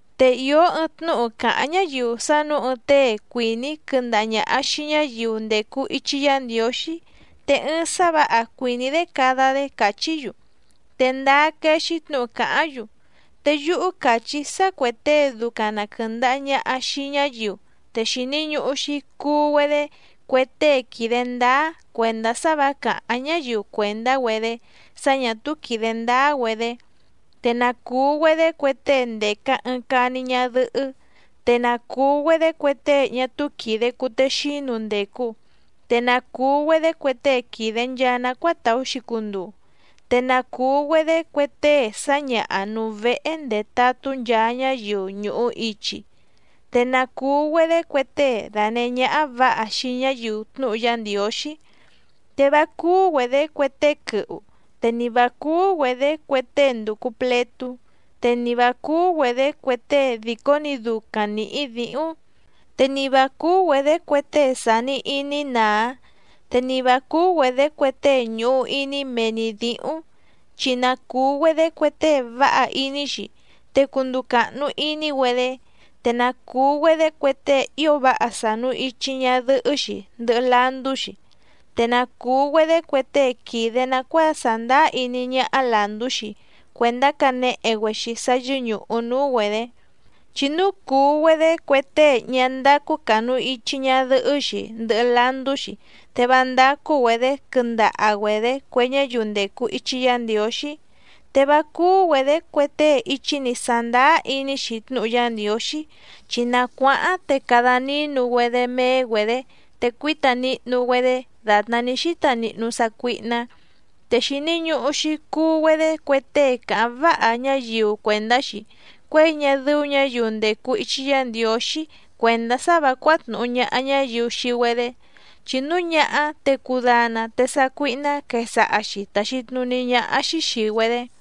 Te ìó ɨɨⁿ tnúhu càháⁿ ñáyiu sá nǔu ɨɨⁿ tée cuìní quɨndaha ñàha xii ñáyiu ndècu ichi Yá Ndiǒxí, te ɨɨⁿ sá vǎha cuìní‑dé cada‑dé càchí‑yu, te ndáá quéé‑xí tnǔhu càháⁿ‑yu. Te yúhú càchí‑í sá cuè tée ducaⁿ na quɨ̀ndaha ñaha xii ñáyiu te xìni ñuhu‑xi cuu‑güedé cue tée quìde ndáá cuèndá sá vǎ càháⁿ ñáyiu cuèndá‑güedé sá ñà túú quìde ndáá‑güedé. Te na cùu‑güedé cue tée ndèca ɨɨⁿ caa‑ni ñadɨhɨ́, te na cùu‑güedé cue tée ñá túú quìde cutexínu ndècu, te na cùu‑güedé cue tée quìde nchaa nacuáa tàú‑xi cunduu, te na cùu‑güedé cue tée sǎñaha nùu vehe ndetatú nchaa ñáyiu ñùhu ichi, te na cùu‑güedé cue tée dànehé ñáhá vǎha xii ñáyiu tnúhu Yá Ndiǒxí. Te vá cúú‑güedě cue tée quɨhu, te ni vǎ cúú‑güedě cue tée ndùcu pletú, te ni vǎ cúú‑güedě cue tée dìcó‑ni ducaⁿ nìhí díhúⁿ, te ni vǎ cúú‑güedě cue tée sàni iní nàá, te ni vǎ cúú‑güedě cue tée ñùhu iní mee‑ni dǐhúⁿ. Chi na cùu‑güedé cue tée váha iní‑xi te cunduu càhnu iní‑güedé. Te na cùu‑güedé cue tée ío váha sànu ichi ñadɨhɨ́‑xi ndɨhɨ landú‑xi, te na cùu‑güedé cue tée quìde nacuáa sàndáá iní ñáhá làndú‑xi cuèndá canehe‑güexi sá yɨ́ñùhu núú‑güedě. Chi núu cùu‑güedé cue tée ñá ndácú cànuichi ñadɨhɨ́‑xi ndɨhɨ landú‑xi, te vá ndácú‑güedě quɨndaha‑güedě cue ñáyiu ndècu ichi Yá Ndiǒxí. Te vá cúú‑güedě cue tée íchí ni sàndáá iní‑xi tnúhu Yá Ndiǒxí, chi na cuáháⁿ te cada nínu‑güedé méé‑güedě te cuíta nihnu‑güedé dàtná ní xíta nihnu sácuíhná. Te xìni ñuhu‑xi cuu‑güedé cue tée càháⁿ váha ñáyiu cuèndá‑xi, cuěi ñá dɨ́ú ñǎyiu ndècu ichi Yá Ndiǒxí cuèndá sá vǎ cuátnùhu ñaha ñáyiu xii‑güedé, chi núu ñáhá te cudana te sácuíhná quesaha‑xi tàxi tnuní ñáhá‑xí xìi‑güedé.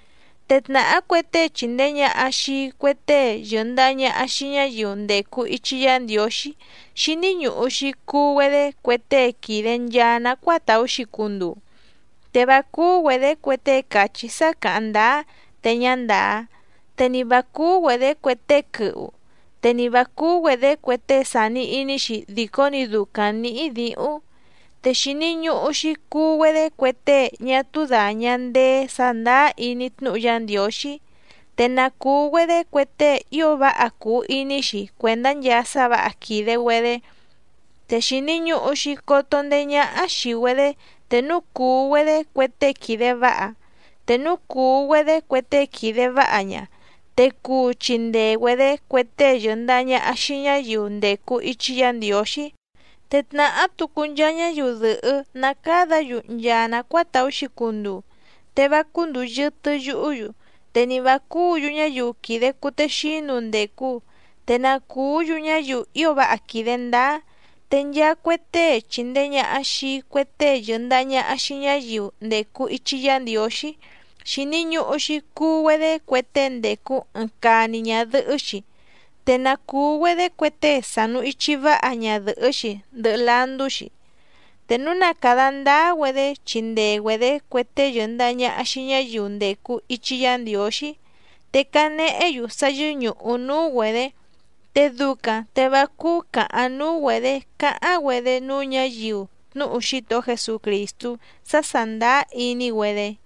Te tnàhá cue tée chindee ñàha xii cue tée yɨ̀ndaha ñaha xii ñáyiu ndècu ichi Yá Ndiǒxí xíní ñùhu‑xi cuu‑güedé cue tée quìde nchaa nacuáa tàú‑xi cunduu, te vá cúú‑güedě cue tée càchí sá càháⁿ ndáá te ñá ndàá, te ni vǎ cúú‑güedě cue tée quɨhu, te ni vǎ cúú‑güedě cue tée sàni iní‑xi dìcó‑ni ducaⁿ nǐhí dǐhúⁿ. Te xìni ñuhu‑xi cuu‑güedé cue tée ñá túú dàña ndeé sàndáá iní tnúhu Yá Ndiǒxí, te na cùu‑güedé cue tée ío váha cùu iní‑xi cuèndá nchaa sá vǎha quìde‑güedé. Te xìni ñuhu‑xi coto ndeé ñáhá xìi‑güedé te núu cùu‑güedé cue tée quìde váha, te núu cùu‑güedé cue tée quìde váha ña te cuu chindee‑güedě cue tée yɨ̀ndaha ñaha xii ñáyiu ndècu ichi Yá Ndiǒxí. Te tnàhá tucu nchaa ñáyiu dɨ̀hɨ́ ná càdá‑yu nchaa nàcuáa tàú‑xi cunduu, te vá cúndùu yɨtɨ yuhú‑yu, te ni vǎ cúǔ‑yu ñáyiu quìde cutexínu ndècu, te na cùú‑yu ñáyiu ío váha quìde ndáá. Te nchaa cue tée chindee ñàha xii cue tée yɨ̀ndaha ñaha xii ñáyiu ndècu ichi Yá Ndiǒxí, xìni ñuhu‑xi cuu‑güedé cue tée ndècu ɨɨⁿ caa‑ni ñadɨhɨ́‑xi, te na cùu‑güedé cue tée sànu ichi váha ñadɨ̀hɨ́‑xi ndɨhɨ landú‑xi. Te núu na càda ndáá‑güedé chindee‑güedě cue tée yɨ̀ndaha ñaha xii ñáyiu ndècu ichi Yá Ndiǒxí, te canehé‑yu sá yɨ́ñùhu núú‑güedě, te ducaⁿ te vá cúú càháⁿ núú‑güedě cáháⁿ‑güedé núú ñǎyiu tnúhu Xítohó Jesucrìstú sá sàndáá iní‑güedé.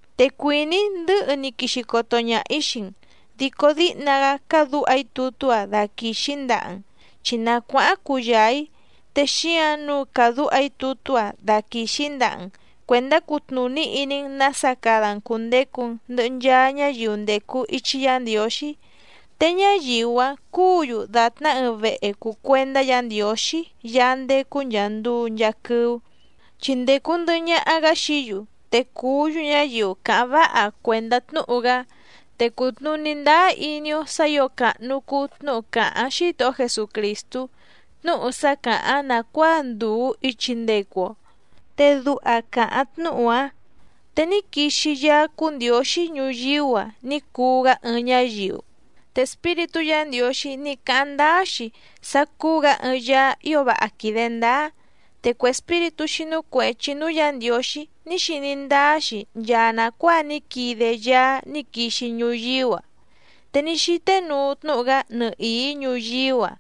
Te cuìní‑í ndɨ̌hɨ‑ni quixi coto ñaha‑ǐ xii‑n dico díhna‑gá cádǔha‑í tutú‑a daquìxi‑í ndaha‑n chi na cuáháⁿ cuyaa‑ǐ. Te xíáⁿ nǔu càdúha‑í tutú‑a daquìxi‑í ndaha‑n cuèndá cutnùní iní‑n nǎsa cada‑n cùndecu‑n ndɨhɨ nchaa ñáyiu ndècu ichi Yá Ndiǒxí. Te ñáyiu‑áⁿ cúǔ‑yu dàtná ɨɨⁿ vehe cùu cuendá Yǎ Ndiǒxí Yaá ndécú nchàa nduu nchaa quɨ́ú, chi ndècu ndɨhɨ ñaha‑gá xií‑yu, te cùú‑yu ñáyiu càháⁿ váha cuèndá tnúhu‑gá. Te cùtnuní ndáá iní‑ó sǎ ǐo càhnu cuu tnúhu càháⁿ Xítohó Jesucrìstú, tnúhu sá càháⁿ nàcuáa ndùu ichi ndecu‑o, te duha càháⁿ tnúhu‑áⁿ: Te ní quixi Yá cúú Ndiǒxí ñuyíú‑a ní cuu‑gá ɨɨⁿ ñáyiu, te Espíritú Yǎ Ndiǒxí ní cáháⁿ ndáá‑xi sá cúú‑gǎ ɨɨⁿ Yaá ío váha quìde ndáá, te cue espíritú xínú cuèchi núú Yǎ Ndiǒxí ní xiní ndáá‑xi nchaa nàcuáa ní quide Yaá ní quixi ñuyíú‑a. Te ní xíté nuu tnúhu‑gá nɨhìí ñuyíú‑a,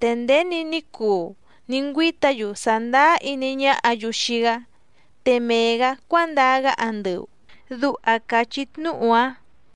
te nděni ní cuu ní ngüíta‑yu sàndáá iní ñáhǎ‑yu xii‑gá, te mee‑gǎ cuándaa‑gá andɨu. Duha càchí tnúhu‑áⁿ.